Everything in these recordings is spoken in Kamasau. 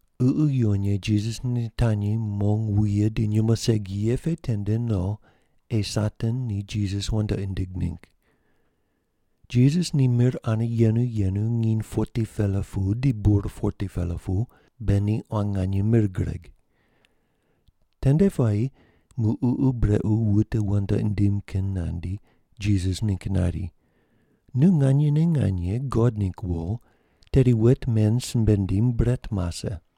Ququ Yuwon Ye Jisas nitanyi mong wuye di nyumo segi ye pe tende no ei Satan ni Jisas wandoqi nindig ningg. Jisas ni mir ane yenu yenu nginy 40-pela pu di bur 40-pela pu, be ni quan nganye mir gureg. Tende puayi muq ququ brequ wute wandoqi nindim kin nandi, Jisas ningg nari, “Nu nganyene nganye God ningg wo, tedi wet men simbe ndim bret mase.”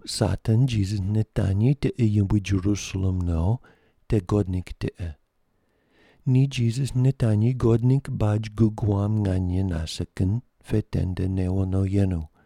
Muq Satan Jisas nitanyi tiqe yumbui Jerusalem no, te God ningg tiqe. Ni Jisas nitanyi God ningg baj gug wam nganye nase kin pe tende newo no yenu.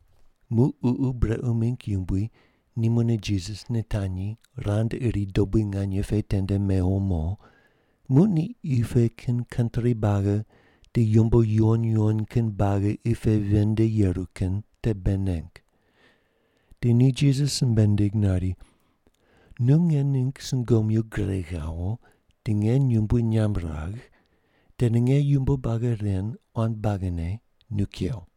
Muq ququ brequ mingg yumbui ni mune Jisas nitanyi rand iri dobui nganye pe tende mewo mo, muq ni qi pe kin kantri buagi di yumbo yuwon yuwon kin buagi qi pe ven nde yeru kin te bei neng. Di ni Jisas simbe nindig nari, “Nu nge ningg sungomyu gure ghawo di nge yumbui nyamb ragh, tedi nge yumbo buagi ren quan buagine nu kew.”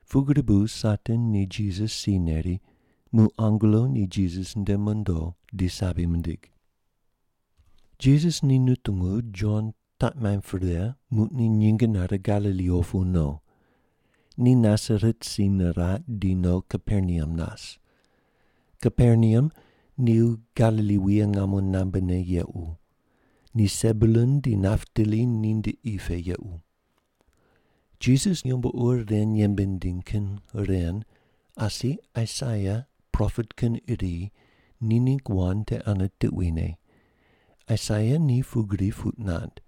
Pugri bu Satan ni Jisas si neri, muq angelo ni Jisas nde mondo di sabi mindig. Jisas ni nutungu Jon taq maimb pre, muq ni nyinge nare Galili opu no. Ni Nasaret si niraq di no Kaperneam nas. Kaperneam ni Galili wuye ngamo qunambe ne yequ. Ni Sebulun di Naptali ninde qi pe yequ. Jisas yumbo ur ren yembe nindiny kin ren, asi Aisaia, propet kin iri, ni ningg wand te ane tuquine. Aisaia ni pugri puq nand: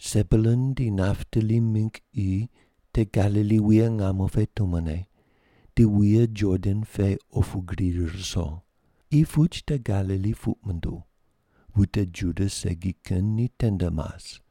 “Sebulun di Naptali mingg qi te Galili wuye ngamo pe tumone, di wuye Jordan pu opu gri ruso. Qi puch te Galili puq munduw. Wute Juda segi kin ni tende mas.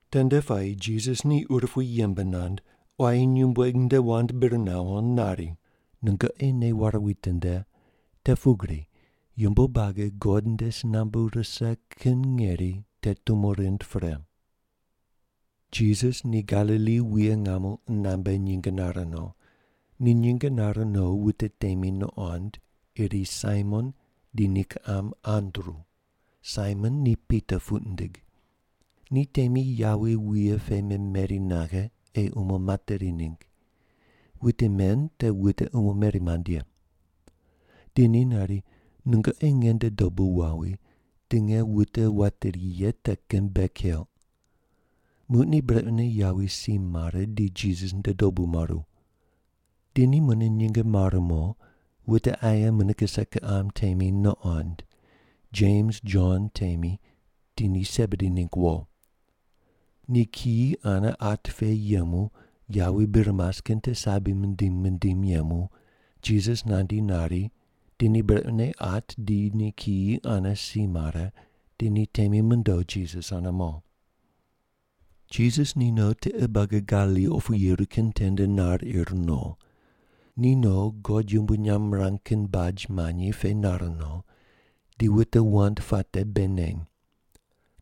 Tende puayi Jisas ni urupui yembe nand, quayi nyumbueg nde wand bir nawo nari, “Nungoqi nei ware witinde, te pugri yumbo buagi God nde si nambu rise kin ngeri te tumo rind pre.” Jisas ni Galili wuye ngamo qunambe nyinge nare no. Ni nyinge nare no wute temi nuqond, iri Saimon di ni kiqam Andru. (Saimon ni Pita puq nindig.) Ni temi yawi wuye pe memeri naghe ei umo materi ningg. Wute men te wute umo meri mand ye. Di ni nari, “Nungoqi nge nde dobu wawi, di nge wute wateri ye te kin bei keuq.” Muq ni brequne yawi si mare di Jisas nde dobu maru. Di ni mune nyinge mare mo, wute aye mune kise kiqam temi nuqond. Jems Jon temi di ni Sebedi ningg wo. Ni kiyi ane at pe yemu yawi bir mas kin te sabi mindim mindim yemu Jisas nandi nari, di ni brequne at di ni kiyi ane si mare, di ni temi mondo Jisas ane mo. Jisas ni no tiqe buagi Galili opu yeru kin tende nar ir no. Ni no God yumbui nyamb mirang kin baj manyi pe nar no, di wute wand puate bei neny.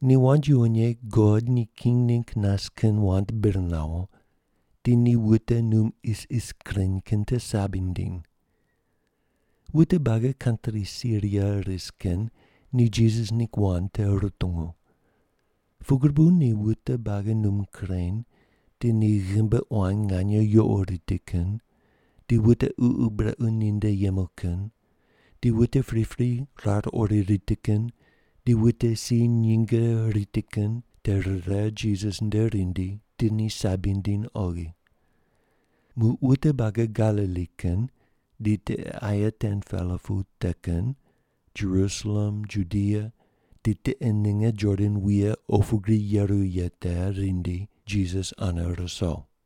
Ni wand yuwon ye God ni king ningg nas kin wand bir nawo, di ni wute num isis kureny kin te sabi nindiny. Wute buagi kantri Siria ris kin ni Jisas ningg wand te rutungu. Pugri bu ni wute buagi num kureny, di ni ghimbi quan nganye yuqo riti kin, di wute ququ brequ ninde yemu kin, di wute pripri rar ori riti kin di wute si nyinge riti kin te rire Jisas nde rindi di ni sabi nindiny oghi. Muq wute buagi Galili kin di tiqe aye 10-pela pu te kin, Jerusalem, Judia di tiqe ninge Jordan wuye opu gri yeru ye te rindi Jisas ane ruso.